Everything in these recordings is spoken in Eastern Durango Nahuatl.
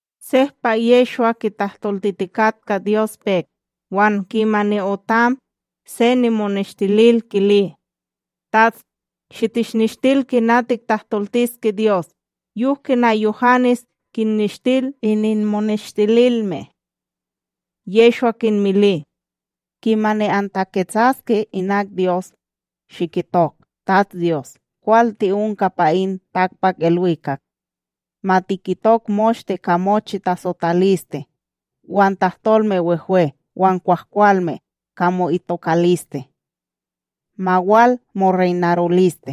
Sehpa Yehshwa kitahtoltitikatka Dyos pek, wan kimani otam, se nimoneshtilil kili: ―TATS, shitishnishtil kina tiktahtoltiske Dyos, yok kina Yuhanes kinnishtil ininmoneshtililme. Yehshwa kinmili: ―Kimani antaketsaske inak Dyos, shikitok: TatsDyos kwal ti'onka pa in takpakIlwikak, ma kitok moshte ka mochi tasotaliste wan tahtolme wehwe wan kwahkwalme ka mo'itokaliste. Ma wal moreynaroliste.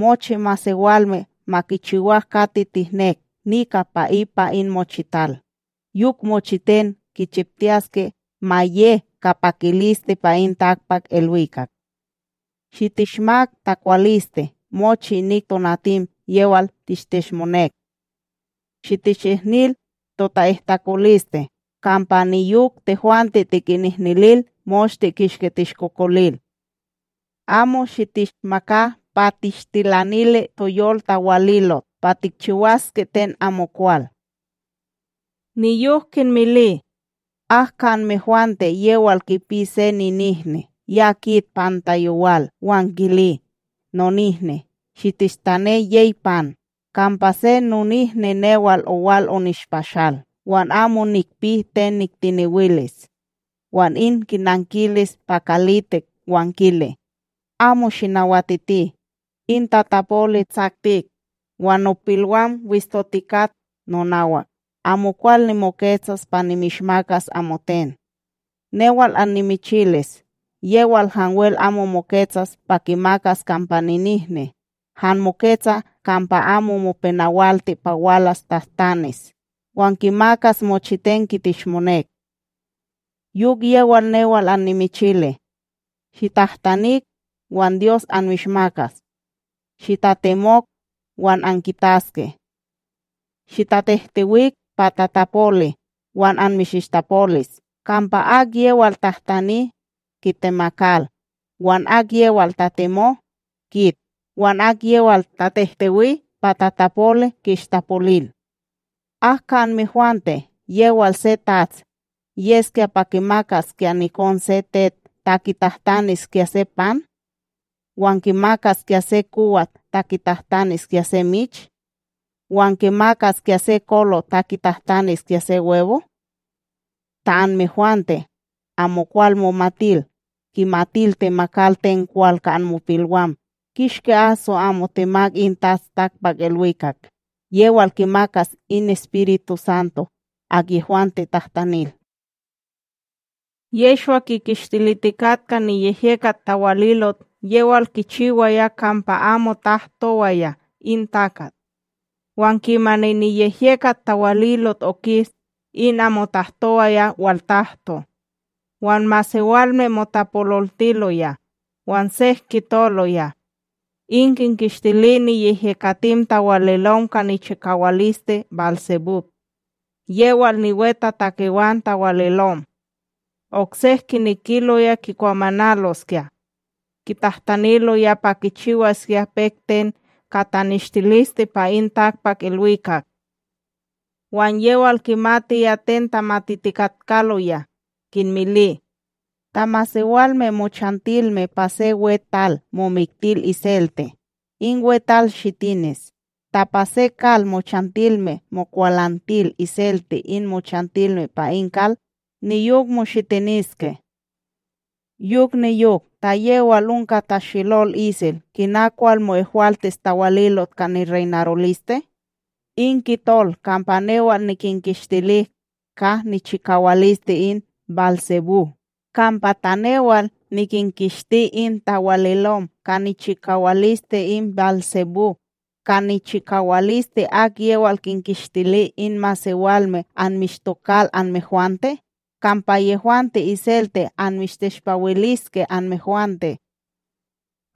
Mochi masewalme ma kichiwak kati tihnek nika pa ipa in mochital, yok mochiten kichiptiyaske ma ye ka pakiliste pa in takpakIlwikak. Shitishmak takwaliste mochi inik tonatim yewal tishteshmonek. Shitishihnil tota'ihtakoliste, kampa niyok tehwante tikinihnilil moshte kishki tishkokolil. Amo shitishmaka pa tishtilanili toyol tawalitot pa tikchiwaske ten amokwal. Niyok kinmili: ―Ak ka anmehwante yewal kipi se ninihni, ya kit panta yowal wan kili: “Nonihni, shinishtane yey pan, kampa se nonihni newal owal onishpashal, wan amo nikpi ten niktiniwilis.” Wan in kinankilis pa kalitik wan kili: “Amo shinawatiti; in tatapoli tsaktik, wan nopilwam wishtotikat nonawak; amokwal nimoketsas pa nimishmakas amoten.” Newal annimichilis yewal hanwel amo moketsas pa kimakas kampa ninihni, han moketsa kampa amo mopenawalti pa walas tahtanis, wan kimakas mochiten kiteshmonek. Yok yewal newal anmichili: Shitahtanik, wan Dyos anmishmakas; shitatemok, wan ankitaske; shitahtehtewik pa tatapoli, wan anmishishtapolis. Kampa akyewal tahtani, kitemakal; wan akyewal tatemo, kit; wan akyewal tatehtewi pa tatapoli, ki'ishtapolil. ’Ak ka anmehwante yewal se tats, yeskya pa kimakaskya nikon se tet ta kitahtaniskya se pan?, wan kimakaskya se kowat ta kitahtaniskya se mich?, wan kimakaskya se kolot ta kitahtaniskya se webo? Ta anmehwante, amokwal momatil, kimatil temakal ten kwal ka anmopilwam, kishki aso amo temak in Tats takpakIlwikak yewal kimakas in EspirituSanto akyehwante tahtanil! Yehshwa kikishtilitikatka niyehyekat tawalilot yewal kichiwaya kampa amo tahtowaya in takat; wan kimani niyehyekat tawalilot okis, in amo tahtowaya waltahto. Wan masewalme motapololtiloya, wan sek kitoloya: ―In kinkishtili niyehyekatim tawalilom ka nichikawaliste BálSebúb, yewal niwetatakewan tawalilom. Oksek, kinekiloya kikwamanaloskya, kitahtaniloya pa kichiwaskya pek ten ka taneshtiliste pa in takpakIlwikak. Wan yewal kimatiya ten tamatitikatkaloya, kinmili: ―Ta masewalme mochantilme pa se weTal momiktil iselte, in weTal shitinis; ta pa se kal mochantilme mokwalantil iselte in mochantilme pa in kal, niyok moshitiniske. Yok niyok, ta yewal onka tashelol isel, kina kwal mo'ehwaltis tawalilot ka nireynaroliste? in kitol kampa newal nikinkishtili ka nichikawaliste in BálSebúb; Kampa ta newal nikinkishti in tawalilom ka nichikawaliste in BálSebúb, ka nichikawaliste akyewal kinkishtili in masewalme anmishtokal anmehwante? Kampa yehwante iselte anmishteshpawiliske anmehwante.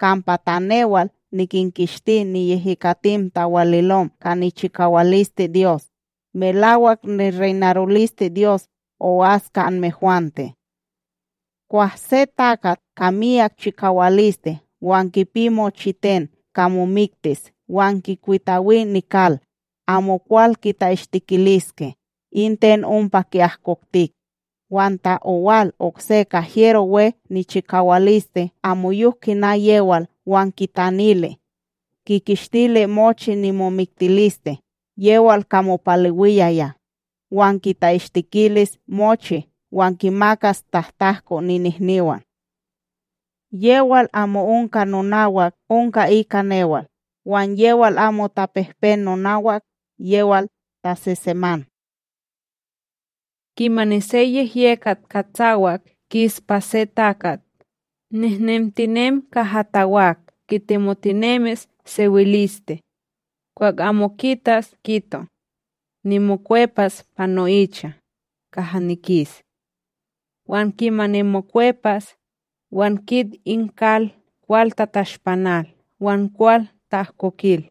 Kampa ta newal nikinkishti niyehyekatim tawalilom ka nichikawaliste Dyos, melawak nireynarolisteDyos o'as ka anmehwante. ’Kwah se takat ka miyak chikawaliste wan kipi mochiten ka momiktis wan kikwitawi nikal, amokwal kita'ishtikiliske in ten ompa ki'ahkoktik. Wan ta owal okse ka hyero we nichikawaliste amoyok kina yewal wan kitanili, kikishtili mochi nimomiktiliste yewal ka mopalewiyaya, wan kita'ishtikilis mochi wan kinmakas tahtahko ninihniwan. ’Yewal amo onka nonawak, onka ika newal; wan yewal amo tapehpen nonawak, yewal taseseman. ’Kimani se yehyekat katsawak kis pa se takat, nehnemtinem kaha tawak kitemotinemis sewiliste; kwah amo kitas kito: “Nimokwepas pa no'icha, kaha nikis.” Wan kimani mokwepas, wan kit in kal kwal tatashpanal wan kwal ta'ahkokil.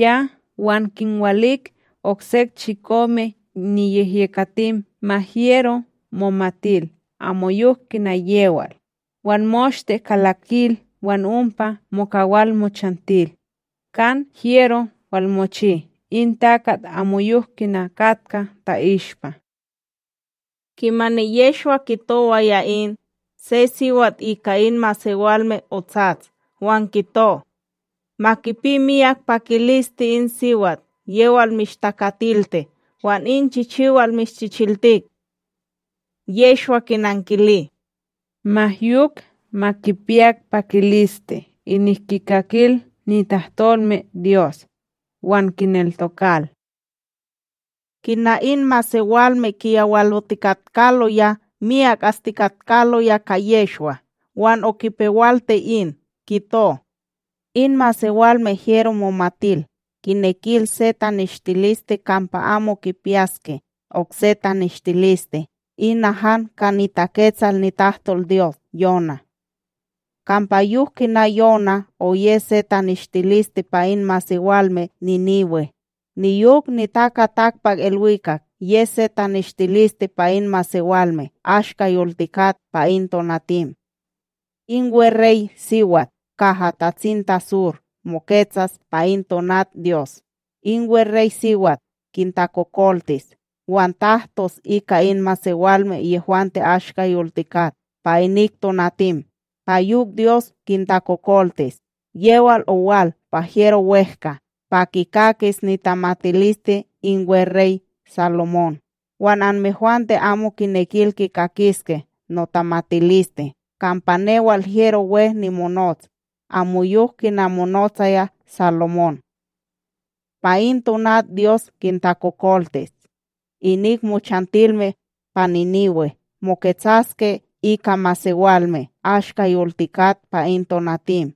Ya wan kinwalik oksek chikome niyehyekatim ma hyero momatil amoyok kina yewal, wan moshte kalakil wan ompa mokawal mochantil, kan hyero walmochi in takat amoyok kina katka ta'ishpa. Kimani Yehshwa kitowaya in, se siwat ika in masewalme otsats wan kito: ―Ma kipi miyak pakiliste in siwat yewal mishtakatilti wan in chichiwal mishchichiltik! Yehshwa kinankili: ―Ma yok ma kipiyak pakiliste inik kikakil nitahtolmeDyos, wan kineltokal! Kina in masewalme kiyawalotikatkaloya miyak astikatkaloya ka Yehshwa, wan okipewalti in, kito: ―In masewalme hyero momatil, kinekil se taneshtiliste kampa amo kipiyaske okse taneshtiliste; ina han ka niTaketsal nitahtolDyos Yoná. Kampa yok kina Yoná oye se taneshtiliste pa in masewalme Níniwe, niyok NitakaTakpakIlwikak yes se taneshtiliste pa in masewalme ashka yoltikat pa in tonatim. In wereySiwat kaha tatsintaSur moketsas pa in tonat Dyos, in wereySiwat kintakokoltis wan tahtos ika in masewalme yehwante ashka yoltikat, pa inik tonatim pa yok Dyos kintakokoltis; yewal owal pa hyero wEhka pa kikakis nitamatiliste in weRey Salomón; wan anmehwante amo kinekil kikakiske notamatiliste kampa newal hyero we nimonots amoyok kina monotsaya Salomón. Pa in tonat Dyos kintakokoltis, inik mochantilme pa Níniwe moketsaske ika masewalme ashka yoltikak pa in tonatim,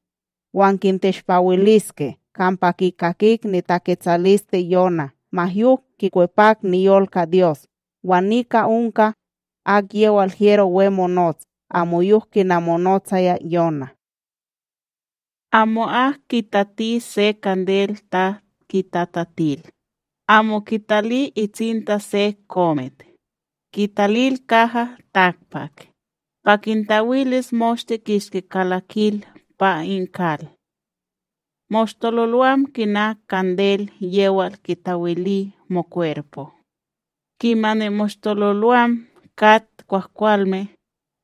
wan kinteshpawiltiske; kampa kikakik nitaketsaliste Yoná ma yok kikwepak niyol ka Dyos wan nika onka akyewal hyero we monots amoyok kina monotsaya Yoná. ’Amo'ak kitati se kandel ta kitatatil, amo kitali itsinta se komit, kitalil kaha takpak, pa kintawilis moshte kishki kalakil pa in kal. Moshtololwam kina kandel yewal kitawili mokwerpo; kimani moshtololwam kat kwahkwalme,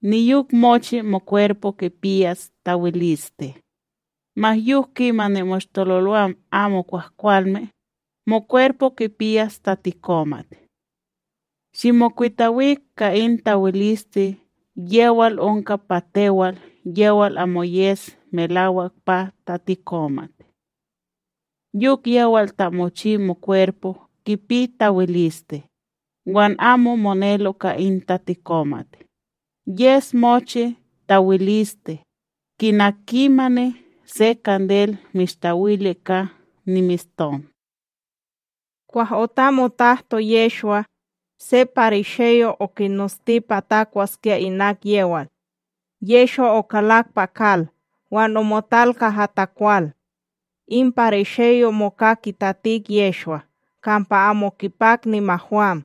niyok mochi mokwerpo kipiyas tawiliste; ma yok kimani moshtololwam amo kwahkwalme, mokwerpo kipiyas tatikomat. Shimokwitawik ka in tawiliste yewal onka pa tewal yewal amo yes melawak pa tatikomak. Yok yewal ta mochi mokwerpo kipi tawiliste, wan amo monelo ka in tatikomat, yes mochi tawiliste, kina kimani se kandel mishtawili ka nimeshton. Kwah otam otahto Yehshwa, se parisheyo okinosti pa takwaskya inak yewal. Yehshwa okalak pa kal wan omotal kaha takwal. In parisheyo moka kitatik Yehshwa kampa amo kipak nimahwam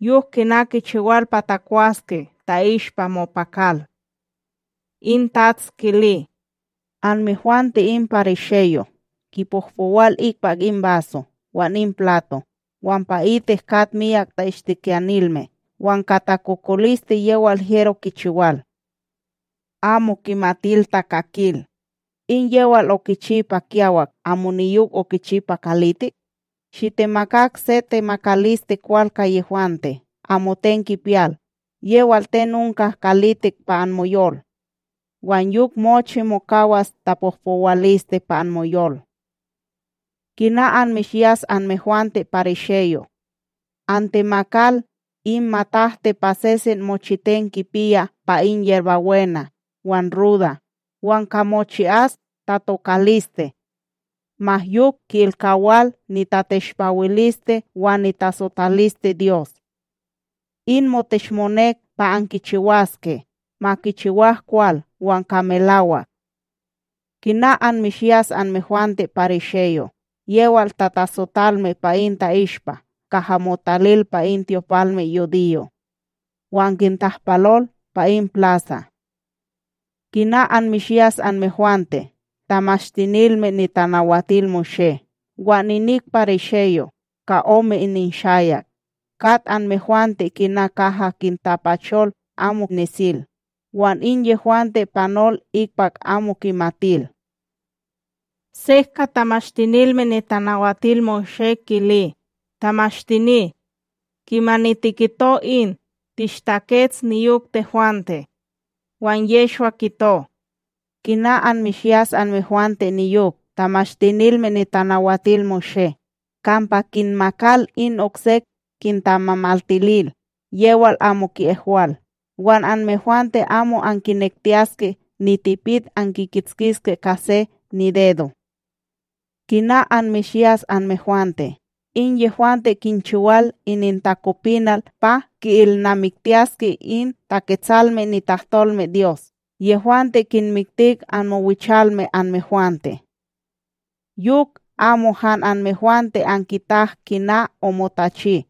yok kina kichiwal pa takwaske ta'ihspa mopakal. In TATS kili: ―Anmehwante in parisheyo' kipohpowal ikpak in baso wan in plato, wan pa itik kat myak ta'ishtikiyanilme wan ka takokoliste yewal hyero kichiwal. Amo kimatil takakil! In yewal okichi pa kiyawak, amo niyok okichi pa kalitik? Shitemakak se temakaliste kwal ka yehwante, amoten kipiyal yewal ten onka kalitik pa anmoyol, wan yok mochi mokawas tapohpowaliste pa anmoyol. ’Kina anmishyas anmehwante, parisheyo'! Antemakal in matahti pa sesen mochiten kipiyaa pa in yerbabwena, wan ruda wan ka mochi'as tatokaliste, ma yok ki'ilkawal nitateshpawiliste wan nitasotaliste Dyos. In moteshmonek pa ankichiwaske, ma kichiwak kwal wan ka melawak. ’Kina anmishyas anmehwante, parisheyo'!, yewal tatasotalme pa in ta'ishpa kaha motatil pa in tyopalmeYudiyo', wan kintahpalol pa in plasa. ’Kina anmishyas anmehwante, Tamashtinilme NitanawatilMoshé wan inik parisheyo', ka ome ininshayak!, kat anmehwante kina kaha kintapachol amo nesil, wan in yehwante panol ikpak amo kimatil. Sek ka Tamashtinilme NitanawatilMoshé, kili: ―Tamashtini, kimani tikito in tishtakets niyok tehwante. Wan Yehshwa kito: ―Kina anmishyas anmehwante niyok, Tamashtinilme NitanawatilMoshé!, kampa kinmakal in oksek kintamamaltilil yewal amo ki'ehwal, wan anmehwante amo ankinektiyaske nitipit ankikitskiske ka se nidedo. ’Kina anmishyas anmehwante!, in yehwante kinchiwal inintakopinal pa ki'ilnamiktiyaske in Taketsalme nitahtolmeDyos yehwante kinmiktik anmowichalme anmehwante. Yok amo han anmehwante ankitak kina omotachi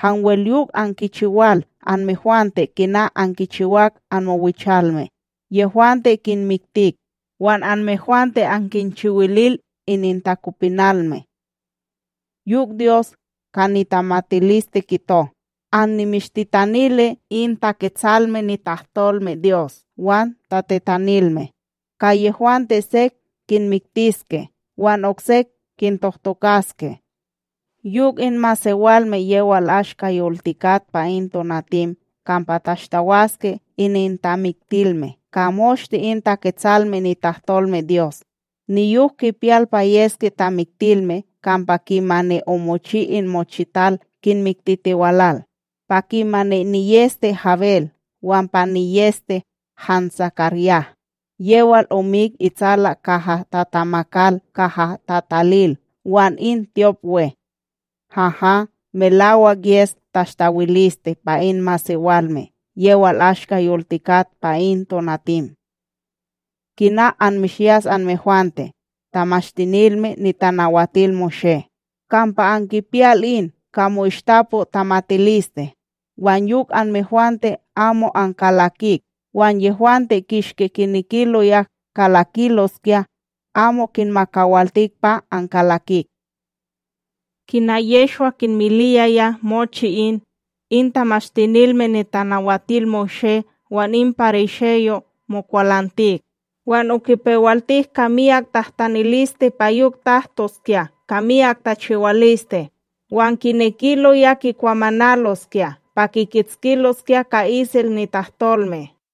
hanwel yok ankichiwal anmehwante kina ankichiwak anmowichalme; yehwante kinmitik, wan anmehwante ankinchiwilil inintakopinalme. ’Yok Dyos ka nitamatiliste kito: “Annimishtitanili in Taketsalme nitahtolmeDyos wan tatetanilme, ka yehwante sek kinmiktiske wan okse kintohtokaske.” Yok in masewalme yewal ashka yoltikak pa in tonatim kampa tashtawaske inintamiktilme ka moshte in Taketsalme nitahtolmeDyos niyok kipiyal pa yeske tamiktilme kampa kimani omochi in mochital kinmiktitiwalal, pa kimani niyEste Habel wan pa niyEste han SakarYah, yewal omik itsala kaha tatamakal kaha tatalil wan in tyopWe. Haha, melawak yes tashtawiliste pa in masewalme yewal ashka yoltikat pa in tonatim. ’Kina anmishyas anmehwante, Tamashtinilme NitanawatilMoshé!, Kampa ankipiyal in ka mo'ishtapo tamatiliste; wan yok anmehwante amo ankalakik wan yehwante kishki kinekiloya kalakiloskya amo kinmakawaltik pa ankalakik. Kina Yehshwa kinmiliyaya mochi in, in Tamashtinilme NitanawatilMoshé wan in parisheyo' mokwalantik, wan okipewaltik ka myak tahtaniliste pa yok tahtoskya ka myak tachiwaliste, wan kinekiloya kikwamanaloskya pa kikitskiloskya ka isel nitahtolme.